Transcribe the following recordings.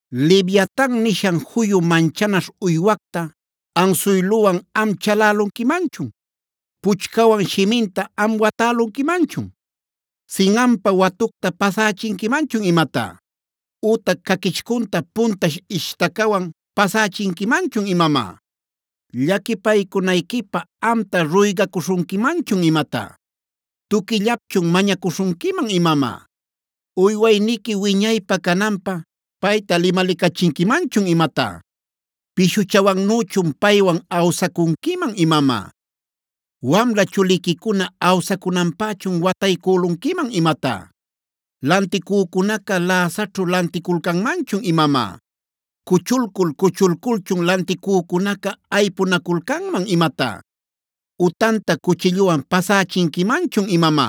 “¿Leviatana nishan juyu manchanaśh uywacta ansuyluwan am chalälunquimanchun? ¿Puchcawan shiminta am watälunquimanchun? ¿Sinꞌanpa watucta pasächinquimanchun imatá? ütac ¿caquichcunta puntash ishtacawan pasächinquimanchun imamá? ¿Llaquipaycunayquipä amta ruygacuśhunquimanchun imatá? ¿Tuquillapchun mañacuśhunquiman imamá? ¿Uywayniqui wiñaypä cananpä payta limalicachinquimanchun imatá? ¿Pishuchawannüchun paywan awsacunquiman imamá? ¿Wamla chuliquicuna awsacunanpächun wataycülunquiman imatá? ¿Lanticücunaca läsaćhu lanticulcanmanchun imamá? ¿Cuchulcul-cuchulculchun lanticücunaca aypunaculcanman imatá? ¿Utanta cuchilluwan pasächinquimanchun imamá?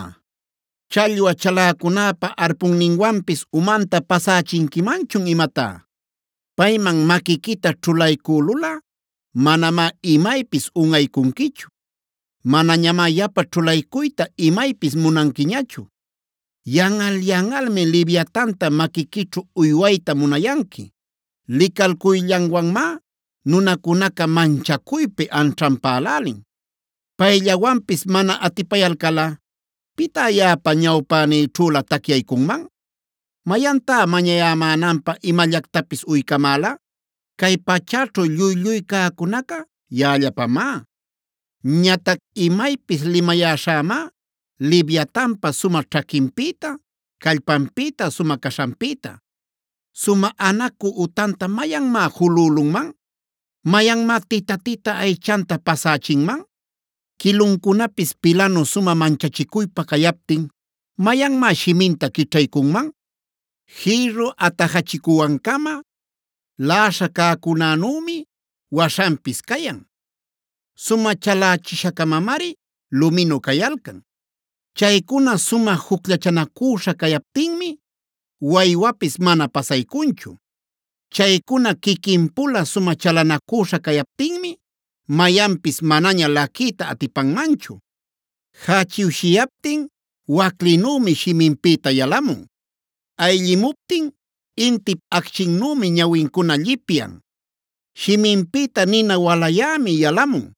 ¿Challwa chaläcunäpa arponninwanpis umanta pasächinquimanchun imatá? Payman maquiquita ćhulaycülulꞌa, manamá imaypis unꞌaycunquichu; manañamá yapa ćhulaycuyta imaypis munanquiñachu. Yanꞌal-yanꞌalmi Leviatanta maquiquićhu uywayta munayanqui; licalcuyllanwanmá nunacunaca manchacuypi anćhanpälälin. Payllawanpis mana atipayalcalꞌa, ¿pitá yaꞌapa ñawpänïćhülä tacyaycunman? ¿Mayantá mañayämänanpä imallactapis uycamäla? Cay pachäćhu lluy-lluy cäcunaca yaꞌallapamá. “Ñatac imaypis limayäśhämá Leviatanpa sumä ćhaquinpïta, callpanpïta, sumä caśhanpïta. ¿Sumä anacü utanta mayanmá julülunman? ¿Mayanmá tita-tita aychanta pasächinman? Quiluncunapis pilanu sumä manchachicuypä cayaptin, ¿mayanmá shiminta quićhaycunman? Jïrru atajachicuwan-cama laꞌaśha cäcunänümi waśhanpis cayan; sumä chalächisha-camamari luminu cayalcan. Chaycuna sumä jucllachanacüśha cayaptinmi, waywapis mana pasaycunchu. Chaycuna quiquin-pula sumä chalanacüśha cayaptinmi mayanpis manaña laquiyta atipanmanchu. “Jächiwshiyaptin waclinümi shiminpïta yalamun; ayllimuptin intip acchinnümi ñawincuna llipyan. Shiminpïta nina walayämi yalamun,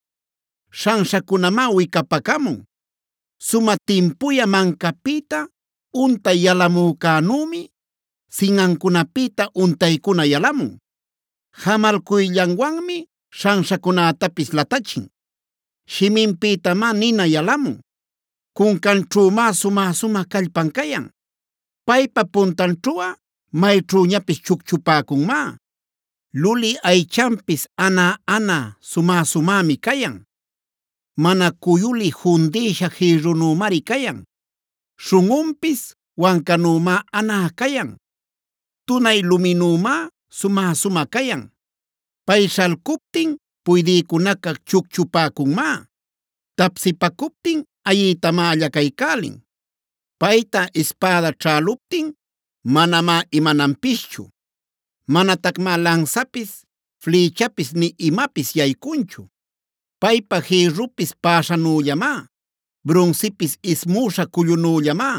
śhanśhacunamá wicapacamun. Sumä timpuyä mancapïta untay yalamücänümi, sinꞌancunapïta untaycuna yalamun. Jamalcuyllanwanmi śhanśhacunätapis latachin; shiminpïtamá nina yalamun. Cuncanćhümá sumä-sumä callpan cayan; paypa puntanćhuꞌa mayćhüñapis chucchupäcunmá. Lulï aychanpis anä-anä, sumä-sumämi cayan; mana cuyulï fundïsha jïrrunümari cayan. Śhunꞌunpis wancanümá anä cayan; tunay luminümá sumä-sumä cayan. Pay śhalcuptin puydïcunaca chucchupäcunmá; tapsipacuptin ayiytamá allacaycälin. Payta ispäda ćhäluptin manamá imananpischu; manatacmá lansapis, flïchapis nï imapis yaycunchu. Paypá jïrrupis päśhanüllamá; brunsipis ismüśha cullunüllamá.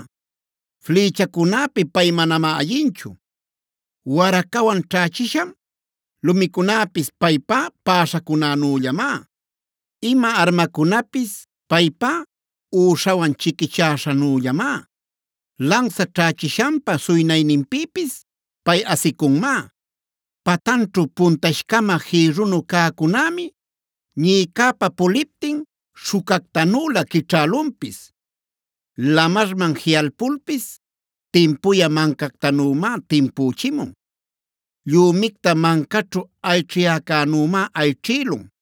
Flïchacunäpi pay manamá ayinchu; waracawan ćhächishan lumicunäpis paypá päśhacunänüllamá. Ima armacunapis paypá üśhawan chiquichäśhannüllamá; lansa ćhächishanpa suynayninpïpis pay asicunmá. Patanćhu puntash-cama jïrrunu cäcunämi, ñïcäpa puliptin śhucactanülä quićhälunpis. Lamarman jiꞌalpulpis timpuyä mancactanümá timpüchimun; llümicta mancaćhu ayćhiyäcänümá ayćhïlun.